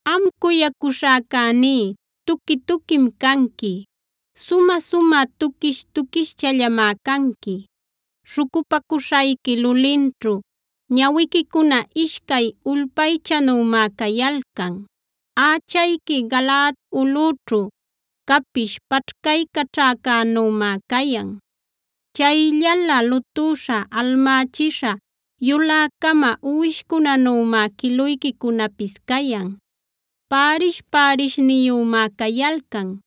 Am cuyacuśhäcäní, tuqui-tuquim canqui. Sumä-sumä tuquish-tuquischallamá canqui; śhucupacuśhayqui lulinćhu ñawiquicuna ishcay ulpaychanümá cayalcan. Ächayqui Galaad ulꞌüćhu capish paćhcaycaćhäcänümá cayan. Chayllala lutüśha, almächisha yulä-cama uwishcunanümá quiluyquicunapis cayan. Pärish-pärishniyümá cayalcan;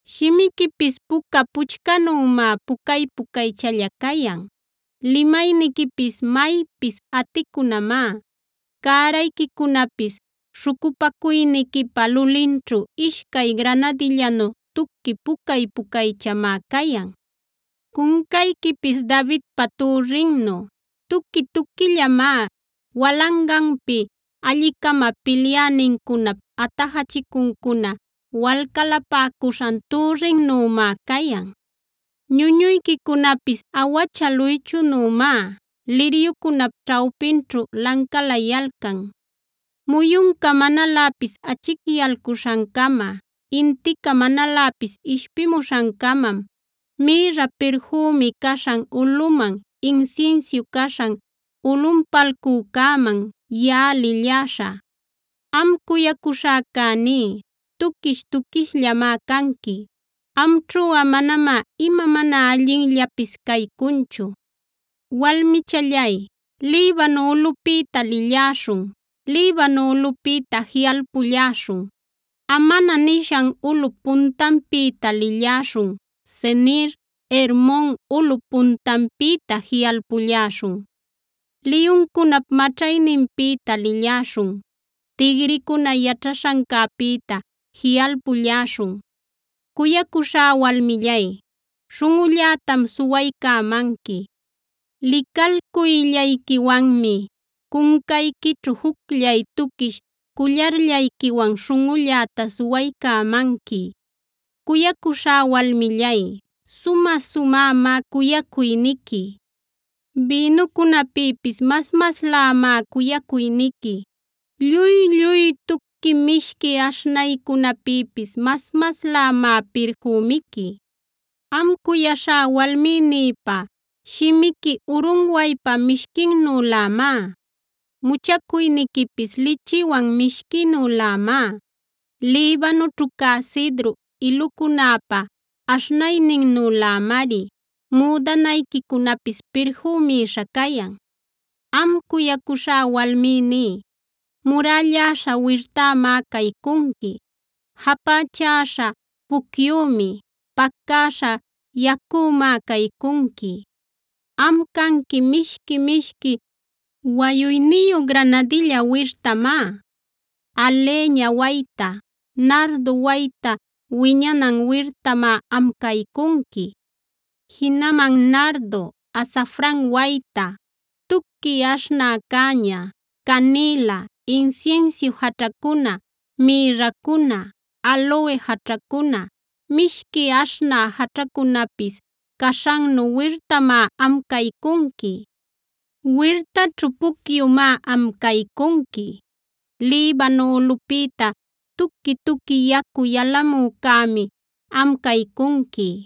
Shimiquipis puca puchcanümá pucay-pucaychalla cayan. Limayniquipis maypis aticunamá, cärayquicunapis śhucupacuyniquipa lulinćhu ishcay granadillanu tuqui pucay-pucaychamá cayan. Cuncayquipis Davidpa türrinnu tuqui-tuquillamá, walanganpi alli-cama pilyänincunap atajachicuncuna walcalapäcuśhan türrinnümá cayan. Ñuñuyquicunapis awacha luychunümá,b liryucunap ćhawpinćhu lancalayalcan. Muyunca manaläpis achicyalcuśhancama, intica manaläpis ishpimuśhancamam mïrra pirfümi caśhan ulꞌuman, insinsiu caśhan ulꞌunpalcücäman yaꞌa lilläśhä. ¡Am cuyacuśhäcäní, tuquish-tuquishllamá canqui! Amćhuꞌa manamá ima mana allinllapis caycunchu. Walmichallay, Libano ulꞌupïta lilläśhun; Libano ulꞌupïta jiꞌalpulläśhun. Amana nishan ulꞌup puntanpïta lilläśhun; Senir, Hermon ulꞌup puntanpïta jiꞌalpulläśhun. Liyuncunap maćhayninpïta lilläśhun; tigricuna yaćhaśhancäpïta jiꞌalpulläśhun. Cuyacuśhá walmillay, śhunꞌullätam suwaycämanqui; licalcuyllayquiwanmi cuncayquićhu jucllay tuquish cullarllayquiwan śhunꞌulläta suwaycämanqui. Cuyacuśhá walmillay, sumä-sumämá cuyacuyniqui. Bïnucunäpïpis mas-maslämá cuyacuyniqui; lluy-lluy tuqui mishqui aśhnaycunäpïpis mas-maslämá pirfümiqui. Am cuyaśhá walmïnïpa, shimiqui urunwaypa mishquinnülämá; muchacuyniquipis lichiwan mishquinülämá. Libanoćhu cä cidru ilucunäpa aśhnayninnülämari müdanayquicunapis pirfümïsha cayan. Am cuyacuśhá walmïní, murälläśha wirtämá caycunqui; japächäśha pucyümi; pacäśha yacümá caycunqui. Am canqui mishqui-mishqui wayuyniyu granadilla wirtamá; alheña wayta, nardo wayta wiñanan wirtamá am caycunqui. Jinaman nardo, azafran wayta, tuqui aśhnä cäña, canïla, insinsiu jaćhacuna, mïrracuna, aloe jaćhacuna, mishqui aśhnä jaćhacunapis caśhannu wirtamá am caycunqui. Wirtaćhu pucyumá am caycunqui; Libano ulꞌupïta tuqui-tuqui yacu yalamücämi am caycunqui.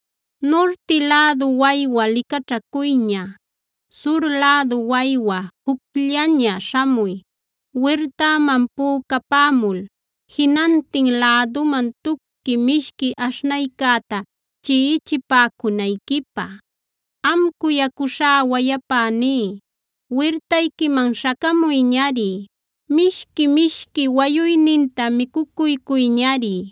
Nurti lädu waywa licaćhacuyña; sur lädu waywa jucllaña śhamuy, wirtäman pücapämul jinantin läduman tuqui mishqui aśhnaycäta chiꞌichipäcunayquipä. Am cuyacuśhá wayapäní, wirtayquiman śhacamuyñari. Mishqui-mishqui wayuyninta micucuycuyñari.